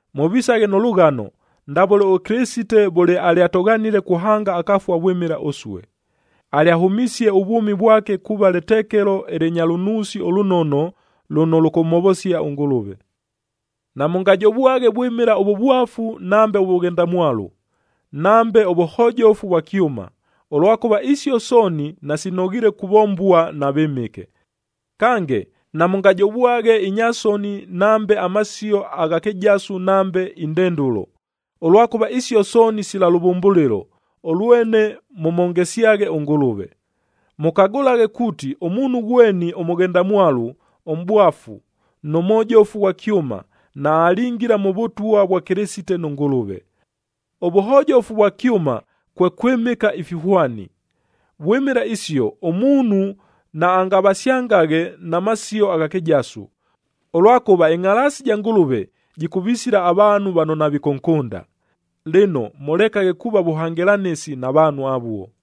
Mʉvisaghe nʉ lʉghano, ndavʉle ʉKɨlɨsite vʉle alyatʉghanile kuhanga akafua vwɨmɨla ʉsue. Alyahʉmisie ʉvwʉmi vwake kuuva lɨtekelo ɨlɨnya lʉnuusi ʉlʉnono lʉno lʉkʉmhovosia ʉNgʉlʉve. Namʉngajovwaghe vwɨmɨla ʉvʉvwafu nambe ʉvʉghendamwalu, nambe ʉvʉhojofu vwa kyʉma, ʉlwakʉva isio sooni nasinoghiile kuvombua na vɨmɨke. Kange, namʉngajovaghe inya soni nambe amasio agha kɨjasu nambe indendʉlo, ʉlwakʉva isio sooni sila lʉvʉmbʉlɨlo, ʉlwene mʉmhongesyaghe ʉNgʉlʉve. Mʉkagʉlaghe kuuti ʉmuunhu ghweni ʉmʉghendamwalu, ʉmʼbwafu, nʉ mhojofu ghwa kyʉma, naalingila mʉ Vʉtwa vwa Kɨlɨsite nʉ Ngʉlʉve. Ʉvʉhojofu vwa kyʉma kwe kwɨmɨka ifihwani. Vwɨmɨla isio, ʉmuunhu naangavasyangaghe na masio agha kɨjasu, ʉlwakʉva ɨngʼhalaasi ja Ngʉlʉve jɨkʉvisila avaanhu vano navikʉnkʉnda. Lɨno, mʉlekaghe kuuva vʉhangɨlanɨsi na vaanhu avuo.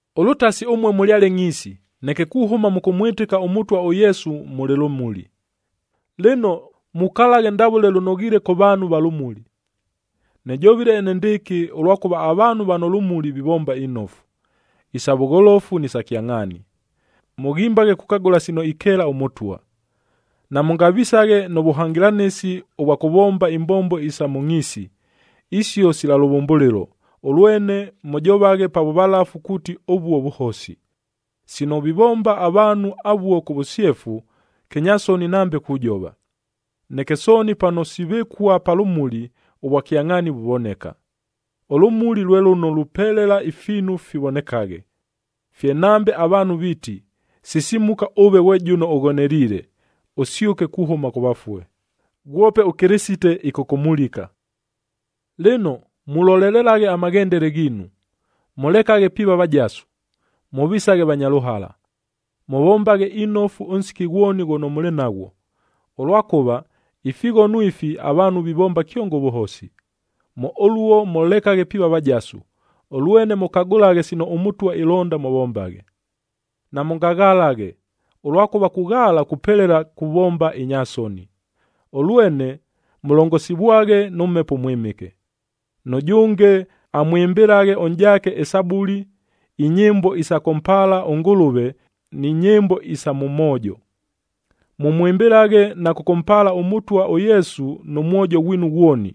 Ʉlʉtasi ʉmue mʉlyale ngʼhiisi, neke kuhʉma mʉkʉmwɨtɨka ʉMʉtwa ʉYesu, mʉlɨ lʉmuli. Lɨno, mukalaghe ndavʉle lʉnoghiile kʉ vaanhu va lʉmuli. Nɨjovile enendɨɨkɨ, ʉlwakʉva avaanhu vano lʉmuli vivomba inofu, isa vʉgholofu ni sa kyangʼhaani. Mʉghimbaghe kukagʉla sino ikeela ʉMʉtwa. Namʉngavisaghe nʉ vʉhangɨlanɨsi ʉvwa kʉvomba imbombo isa mʉ ngʼhiisi, isio sila lʉvʉmbʉlɨlo, ʉlwene mʉjovaghe pa vʉvalafu kuuti ʉvuo vʉhosi. Sino vivomba avaanhu avuo kʉ vʉsyefu, kɨnyasoni nambe kujova. Neke sooni pano sivɨkua pa lʉmuli, ʉvwakyangʼhaani vuvoneka. Ʉlʉmuli lwe lʉno lupelela ifiinu fivonekaghe. Fye nambe avaanhu viiti, “Sisimuka ʉve ghwe jʉno ʉghoneliile! Ʉsyʉke kuhʉma kʉ vafue. Ghwope ʉKɨlɨsite ɨkʉkʉmulika.” Lɨno, mulolelelaghe amaghendele ghiinu. Mʉlekaghe piiva vajasu, mʉvisaghe vanya lʉhala. Mʉvombaghe inofu ʉnsiki ghwoni ghʉno mʉlɨ naghwo, ʉlwakʉva ifighono ifi avaanhu vivomba kyongo ʉvʉhosi. Mʉ ʉluo mʉlekaghe piiva vajasu, ʉlwene mʉkagʉlaghe sino ʉMʉtwa ilonda mʉvombaghe. Namʉngaghalaghe, ʉlwakʉva kughaala kupelela kuvomba inya soni, ʉlwene mʉlongosivwaghe nʉ Mhepo ʉMwɨmɨke. Nʉjʉnge amwɨmbɨlaghe ʉnʼjaake ɨSabuli, inyɨmbo isa kʉmpaala ʉNgʉlʉve ni nyɨmbo isa mʉ moojo. Mʉmwɨmbɨlaghe na kʉkʉmpaala ʉMʉtwa ʉYesu nʉ mwojo ghwinu ghwoni.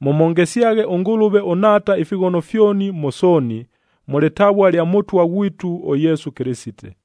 Mʉmhongesyaghe ʉNgʉlʉve ʉNhaata ifighono fyoni mʉ sooni, mʉ lɨtavua lya Mʉtwa ghwitu ʉYesu Kɨlɨsite.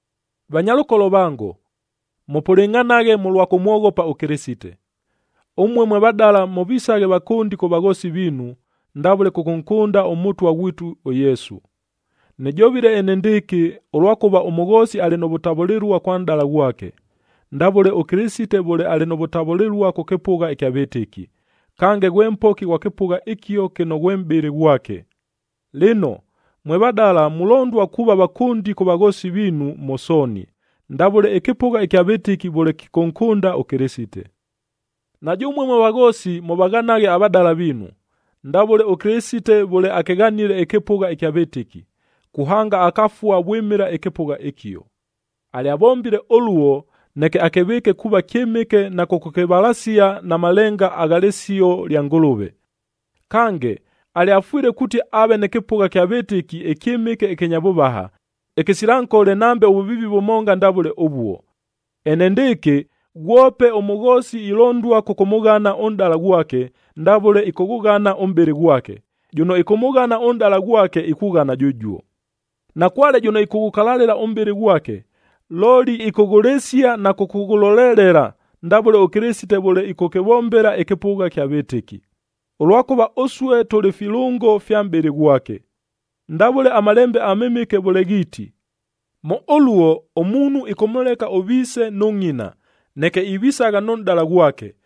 Vanyalʉkolo vango, mʉpʉlɨngʼhanaghe mʉlwa kʉmwoghopa ʉKɨlɨsite. Ʉmue mwe vadala mʉvisaghe vakʉndi kʉ vaghoosi viinu, ndavʉle kʉkʉnkʉnda ʉMʉtwa ghwitu ʉYesu. Nɨjovile enendɨɨkɨ, ʉlwakʉva ʉmʉghoosi alɨ nʉ vʉtavʉlɨlua kwa nʼdala ghwake, ndavʉle ʉKɨlɨsite vʉle alɨ nʉ vʉtavʉlɨlua kʉ kɨpʉgha ɨkya vɨtɨki, kange ghwe Mpoki ghwa kɨpʉgha ɨkio kɨno ghwe mʼbɨlɨ ghwake. Lɨno, mwe vadala mulondua kuuva vakʉndi kʉ vaghoosi viinu mʉ sooni, ndavʉle ɨkɨpʉgha ɨkya vɨtɨki vʉle kɨkʉnkʉnda ʉKɨlɨsite. Na jʉmue mwe vaghoosi mʉvaghanaghe avadala viinu, ndavʉle ʉKɨlɨsite vʉle akɨghanile ɨkɨpʉgha ɨkya vɨtɨki, kuhanga akafua vwɨmɨla ɨkɨpʉgha ɨkio. Alyavombile ʉluo, neke akɨvɨɨke kuuva kyɨmɨke na kʉkʉkɨvalasia na malenga agha lɨsio lya Ngʉlʉve. Kange, alyafwile kuuti aave nɨ kɨpʉgha kya vɨtɨki ɨkyɨmɨke ɨkɨnya vʉvaha, ɨkɨsila nkole nambe ʉvʉviivi vʉmonga ndavʉle ʉvuo. Enendɨɨkɨ ghwope ʉmʉghoosi ilondua kʉkʉmʉghana ʉnʼdala ghwake, ndavʉle ɨkʉghʉghana ʉmʼbɨlɨ ghwake. Jʉno ɨkʉmʉghana ʉnʼdala ghwake ikughana jʉjuo. Nakwale jʉno ɨkʉghʉkalalɨla ʉmʼbɨlɨ ghwake, looli ɨkʉghʉlɨsia na kʉkʉghʉlolelela, ndavʉle ʉKɨlɨsite vʉle ɨkʉkɨvombela ɨkɨpʉgha ɨkya vɨtɨki, ʉlwakʉva ʉsue tʉlɨ filʉngo fya mʼbɨlɨ ghwake. Ndavʉle aMalembe aMɨmɨke vʉle ghiiti, “Mʉ ʉluo, ʉmuunhu ɨkʉmʉleka ʉviise nʉ ngʼina, neke ivisagha nʉ nʼdala ghwake,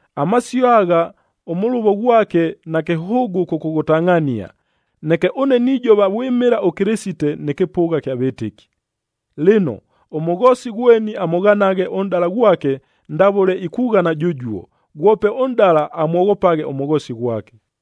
Amasio agha ʉmʉlʉvo ghwake nakɨhʉʉgʉ kʉkʉghʉtangʼhania, neke ʉne nijova vwɨmɨla ʉKɨlɨsite nɨ kɨpʉgha kya vɨtɨki. Lɨno, ʉmʉghoosi ghweni amʉghanaghe ʉnʼdala ghwake ndavʉle ikughana jʉjuo, ghwope ʉnʼdala amwoghopaghe ʉmʉghoosi ghwake.